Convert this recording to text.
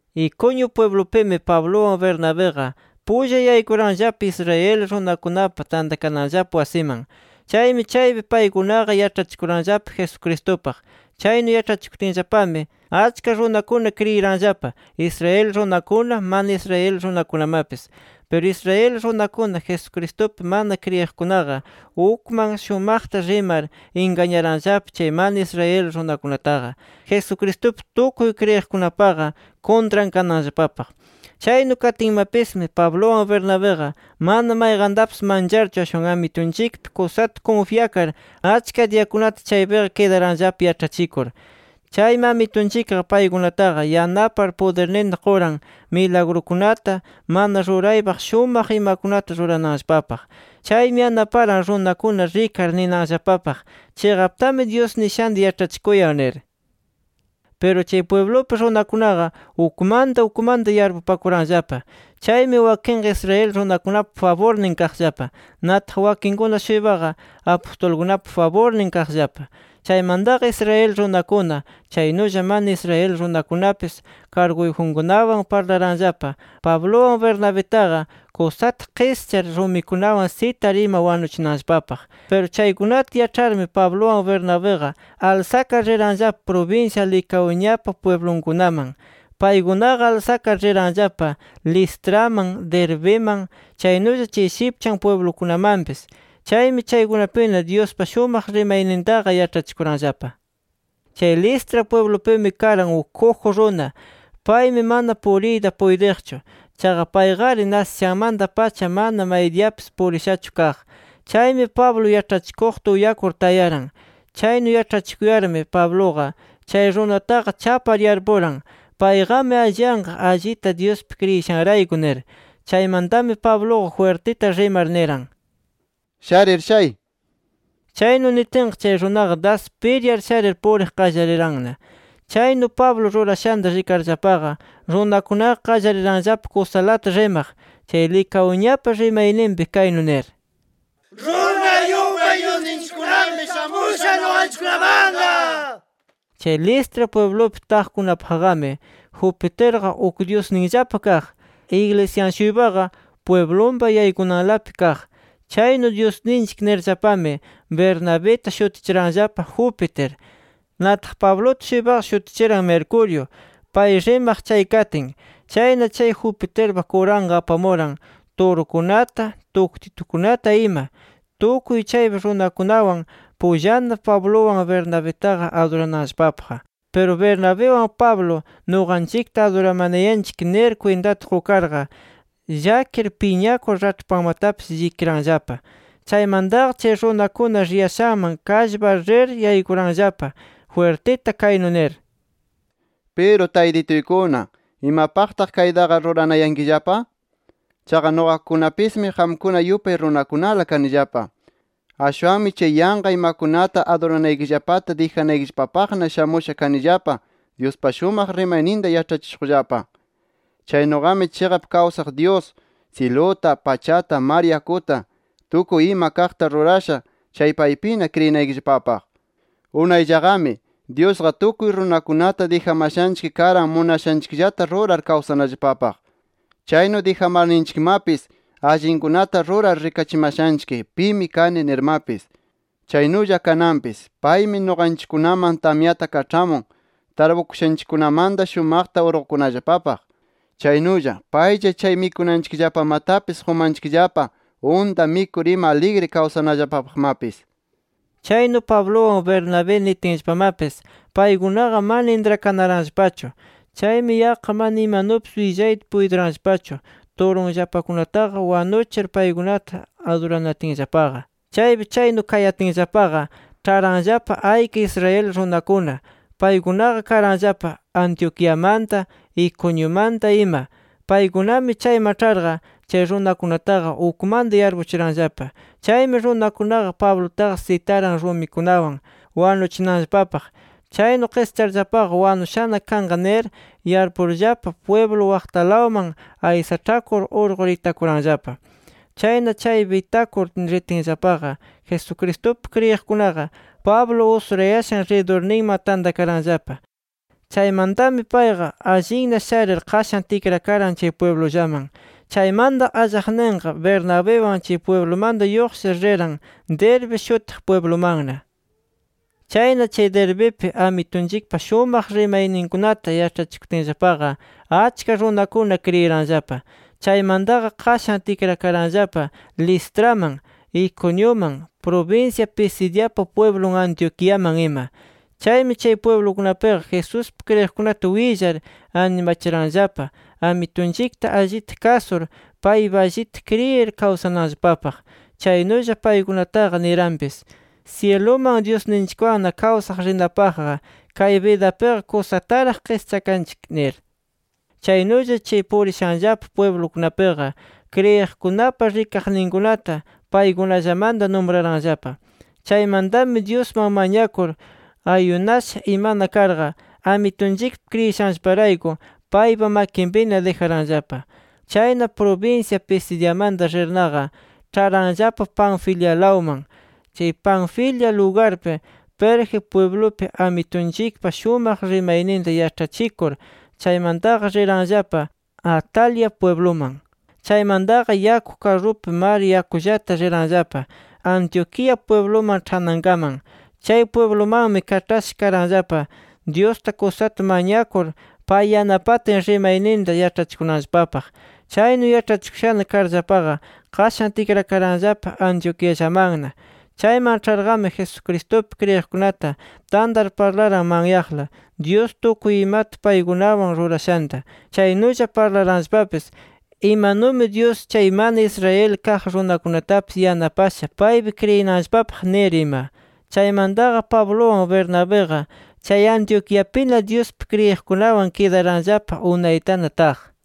Iconio pwiblupimi, Pabluwan Bernabiqa pulla yaykuranllapa Israel runakunapa tantakananllapa wasiman. Chaymi, chaypi paykunaqa yaĉhachikuranllapa Jesucristupaq. Chaynu yaĉhachikutinllapami achka runakuna kriyiranllapa, Israel runakuna, mana Israel runakunamapis. Piru Israel runakuna Jesucristupi mana kriyiqkunaqa ukman shumaqta rimar ingañaranllapa chay mana Israel runakunataqa, Jesucristupi tukuy kriyiqkunapaqa kuntran kananllapapaq. Chaynu katinmapismi, Pabluwan Bernabiqa mana mayqantapis mancharchu, ashwan Amitunchikpi kusata kunfyakar, achka diyakunata chaypiqa kidaranllapa yaĉhachikur. Chaymi Amitunchikqa paykunataqa yanapar, pudirninta quran, milagrukunata, mana ruraypaq shumaq imakunata rurananllapapaq. Chaymi yanaparan runakuna rikar ninanllapapaq, chiqaptami Dyus nishanta yaĉhachikuyan nir. Piru, chay pwiblupi runakunaqa ukmanta ukmanta yarpupakuranllapa. Chaymi wakinqa Israel runakunapa faburnin kaqllapa. Nataq wakinkuna-shuypaqa Apustulkunapa faburnin kaqllapa. Chaymantaqa, Israel runakuna, chaynulla mana Israel runakunapis karguyjunkunawan parlaranllapa, Pabluwan Bernabitaqa kusata qischar, rumikunawan sitar ima wanuchinanllapapaq. Piru chaykunata yaĉharmi Pabluwan Bernabiqa alsakar riranllapa prubinsya Licaoniapa pwiblunkunaman. Paykunaqa alsakar riranllapa Listraman, Derbiman, chaynulla chay shipchan pwiblukunamanpis. Chaymi chaykunapina Dyuspa shumaq rimaynintaqa yaĉhachikuranllapa. Chay Listra pwiblupimi, karan uk kuju runa. Paymi mana puriyta puytiqchu. Chaqa payqari nasishanmanta-pacha mana maydiyapis purishachu kaq. Chaymi Pablo yaĉhachikuqta uyakur tayaran. Chaynu yaĉhachikuyarmi, Pabluqa chay runataqa chapar yarpuran, payqami alliyanqa allita Dyuspi kriyishanrayku nir. Chaymantami, Pabluqa jwirtita rimar niran: —¡Sharir shay! nir. Chaynu nitinqa chay runaqa das piryar sharir, puriq qallariranna. Chaynu Pablo rurashanta rikarllapaqa, runakunaqa qallariranllapa kusalata rimaq chay Licaoniapa rimayninpi, kaynu nir: —¡Runa yupay dyusninchikkunami shamusha nuqanchikkunamanqa! nir. Chay Listra pwiblupi taqkunapaqqami Jupiterqa uk dyusninllapa kaq. Iglisyan-shuypaqa, pwiblunpa yaykunanlapi kaq. Chaynu dyusninchik nirllapami, Bernabita shutichiranllapa Jupiter. Nataq Pabluta-shuypaqa shutichiran Mercurio, pay rimaq chay katin. Chayna chay Jupiterpa kuranqa apamuran turukunata, tuktitukunata ima, tukuy chaypi runakunawan pullana, Pabluwan Bernabitaqa adurananllapapaq. Piru Bernabiwan Pablo, nuqanchikta aduramanayanchik nir kwintata qukarqa, llakir piñakur raĉhpanmatapis llikiranllapa. Chaymantaqa, chay runakuna riyashanman kallpar rir yaykuranllapa, jwirtita kaynu nir: —Piru taytituykuna, ¿imapaqtaq kaytaqa ruranayankillapa? Chaqa, nuqakunapis qamkuna yupay runakunala kanillapa. Ashwanmi chay yanqa imakunata aduranaykillapata dijanaykillapapaqna shamusha kanillapa Dyuspa shumaq rimayninta yaĉhachishuqllapa. Chaynuqami chiqap kawsaq Dyus, syiluta, pachata, mar yakuta, tukuy ima kaqta rurasha, chay paypina kriyinaykillapapaq. Unayllaqami, Dyusqa tukuy runakunata dijamashanchik karan munashanchikllata rurar kawsanallapapaq. Chaynu dijamarninchikmapis, allinkunata rurar rikachimashanchik, ‘Pimi kani’ nirmapis. Chaynulla kananpis, paymi nuqanchikkunaman tamyata kaĉhamun, tarpukushanchikkunamanta shumaqta urqukunallapapaq. Chaynulla, paylla chay mikunanchikllapamatapis qumayanchikllapa unta mikur ima aligri kawsanallapapaqmapis. Chaynu Pabluwan Bernabé nitinllapamapis paykunaqa mana intrakanaranllapachu. Chaymi yaqqa mana imanupis willayta puytiranllapachu turunllapakunataqa wanuchir paykunata aduranatinllapaqa. Chaypi chaynu kayatinllapaqa, ĉharanllapa ayka Israel runakuna. Paykunaqa karanllapa Antioquiamanta, Iconiumanta ima. Paykunami chayman ĉharqa chay runakunataqa ukmanta yarpuchiranllapa. Chaymi runakunaqa Pablutaqa sitaran rumikunawan wanuchinanllapapaq. Chaynu qischarllapaqa, wanushana kanqa nir yarpurllapa pwiblu waqtalawman aysaĉhakur urqur itakuranllapa. Chayna, chaypi itakur ritinllapaqa, Jesucristupi kriyiqkunaqa Pablo usurayashan ridurninman tantakaranllapa. Chaymantami payqa allinna sharir qashan tikrakaran chay pwiblullaman. Chaymanta, allaqninqa Bernabiwan chay pwiblumanta lluqshir, riran Derbe shutiq pwiblumanna. Chayna chay Derbipi, Amitunchikpa shumaq rimayninkunata yaĉhachikutinllapaqa, achka runakuna kriyiranllapa. Chaymantaqa qashan tikrakaranllapa Listraman, Iconiuman, prubinsya Pisidiapa pwiblun Antioquiakaman ima. Chaymi, chay pwiblukunapiqa Jesuspi kriyiqkunata willar animachiranllapa Amitunchikta allita kasur, paypi allita kriyir kawsananllapapaq. Chaynulla paykunataqa niranpis: “Syiluman Dyusninchikwanna kawsaq rinapaqqa, kay bidapiqa kusataraq qischakanchik” nir. Chaynulla, chay purishanllapa pwiblukunapiqa, kriyiqkunapa rikaqninkunata paykunallamanta numraranllapa. Chaymantami Dyusman mañakur, ayunasha imana karqa, Amitunchikpi kriyishanllaparayku, paypa makinpina dijaranllapa. Chayna, prubinsya Pisidiamanta rirnaqa, ĉharanllapa Panfilialawman. Chay Panfilia lugarpi Perge pwiblupi, Amitunchikpa shumaq rimayninta yaĉhachikur, chaymantaqa riranllapa Atalia pwibluman. Chaymantaqa, yaku karrupi mar yakullata riranllapa Antioquía pwibluman ĉhanankaman. Chay pwiblumanmi kaĉhasha karanllapa, Dyusta kusata mañakur, pay yanapatin rimayninta yaĉhachikunanllapapaq. Chaynu yaĉhachikushana karllapaqa, qashan tikrakaranllapa Antioquiallamanna. Chayman ĉharqami, Jesucristupi kriyiqkunata tantar parlaran manyaqla, Dyus tukuy imata paykunawan rurashanta. Chaynulla parlaranllapapis imanumi Dyus, chay mana Israel kaq runakunatapis yanapasha paypi kriyinanllapapaq nir ima. Chaymantaqa Pabluwan Bernabiqa, chay Antioquiapina Dyuspi kriyiqkunawan kidaranllapa unaytana taq.